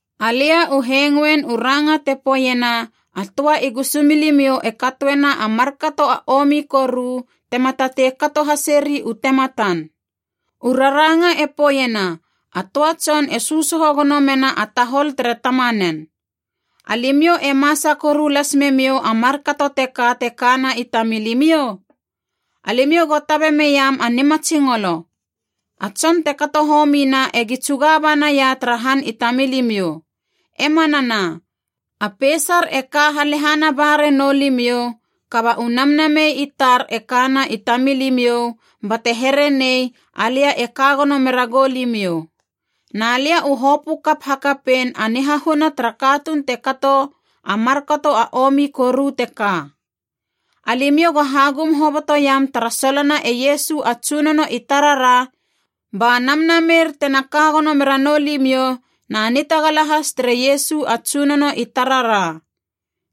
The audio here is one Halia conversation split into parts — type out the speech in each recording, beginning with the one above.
Alia u hengoin u ranga te poeiena a töa i gusumilimiou e katoena a markato a omi koru tema tatei kato haseri u tematan. U raranga e poeiena a töa tson e sösoho gono mena a tahol tere tamanen. Alimiou e masa koru las memiou a markato teka te kana i tamilimiou? Alimiou go tabe meiam a nimatsingolo. A tson te kato homina egi tsuga banaia tara han i tamilimiou. E manana, a peisar e ka halehana ba renou limiou, kaba u namnamei i tar e kana i tamilimiou, bate here nei alia e ka gono mera goulimiou. Na lia u hopö kap hakapein a nihahuna tara katuun te kato a markato a omi koru teka. Alimiou go hagum hobotoiam tara solona e Iesu a Tsunono i tarara, ba namnameir tena ka gono mera noulimiou na nitagala has tere Iesu a Tsunono i tarara.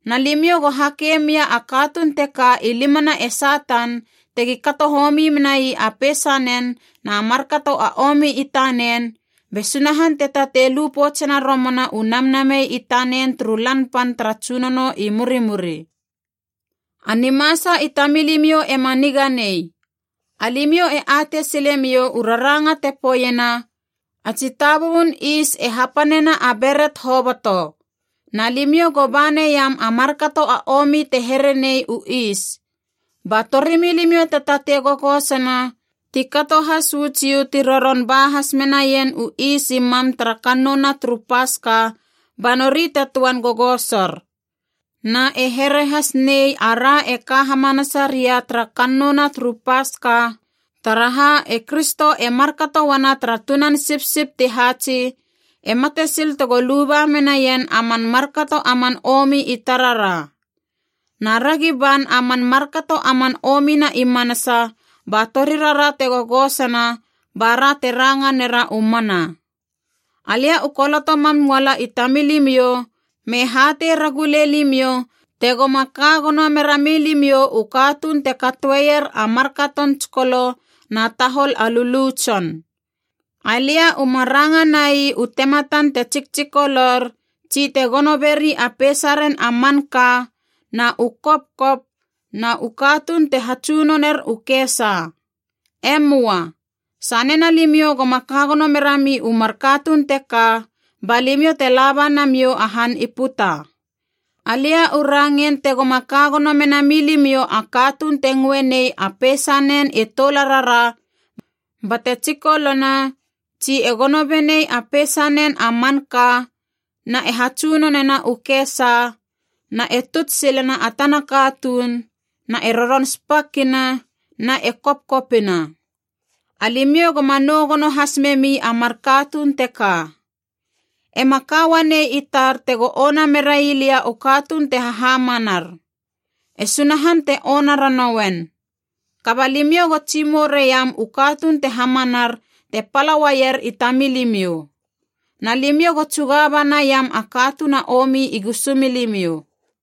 Na limiou go hakei mia a katuun teka i limana e Satan tegi kato homi menai a peisanen na markato a omi i tanen, be Sunahan te tatei lu poutsena romana u namnamei i tanen turu Lan Pan tara Tsunono i murimuri. A nimasa i tamilimiou ema niga nei. Alimiou e atei silemiou u raranga te poeiena, “A tsitabubun is e hapanena a beret hoboto.” Na limiou go ba neiam a markato a omi te here nei u is, ba torimilimiou te tatei gogosona, ti kato has uu Jiu ti roron ba has menaien u is i mam tara kannouna turu Paska ba nori te töan gogosor. Na e here has nei ara e ka hamanasa ria tara kannouna turu Paska, taraha e Kristo e markato uana tara tunan sipsip ti haatsi, e mate sil tego luba menaien a man markato a man omi i tarara. Na ragi ban a man markato a man omina i manasa ba torirara te gogosona bara te ranga nera u mana. Alia u koloto mam uala i tamilimiou, me hatei ragule limiou tegoma ka gono mera milimiou u katuun te katoeier a markaton tsikolo na tahol a lulu tson. Alia uma ranga nai u tematan te tsiktsikolor tsi te gono beri a peisaren a manka na u kopkop na u katuun te hatsunoner u kesa. E möa. Sanena limiou goma ka gono merami u mar katuun teka, ba limiou te laba namiou a han i puta. Alia u rangein tegoma ka gono mena milimiou a katuun te ngöe nei a peisanen e toularara bate tsikolona tsi e gono benei a peisanen a manka na e hatsunonena u kesa na e tuts silena a tana katuun na e roron spakina na e kopkopina. Alimiou goma nou gono has memi a mar katuun teka. E ma ka uanei i tar tego ona merai lia u katuun te hahamanar. E Sunahan te ona ranouen. Kaba limiou go tsimou reiam u katuun te hamanar te pala uaier i tamilimiou. Na limiou go tsuga ba naiam a katuun a omi i gusumilimiou.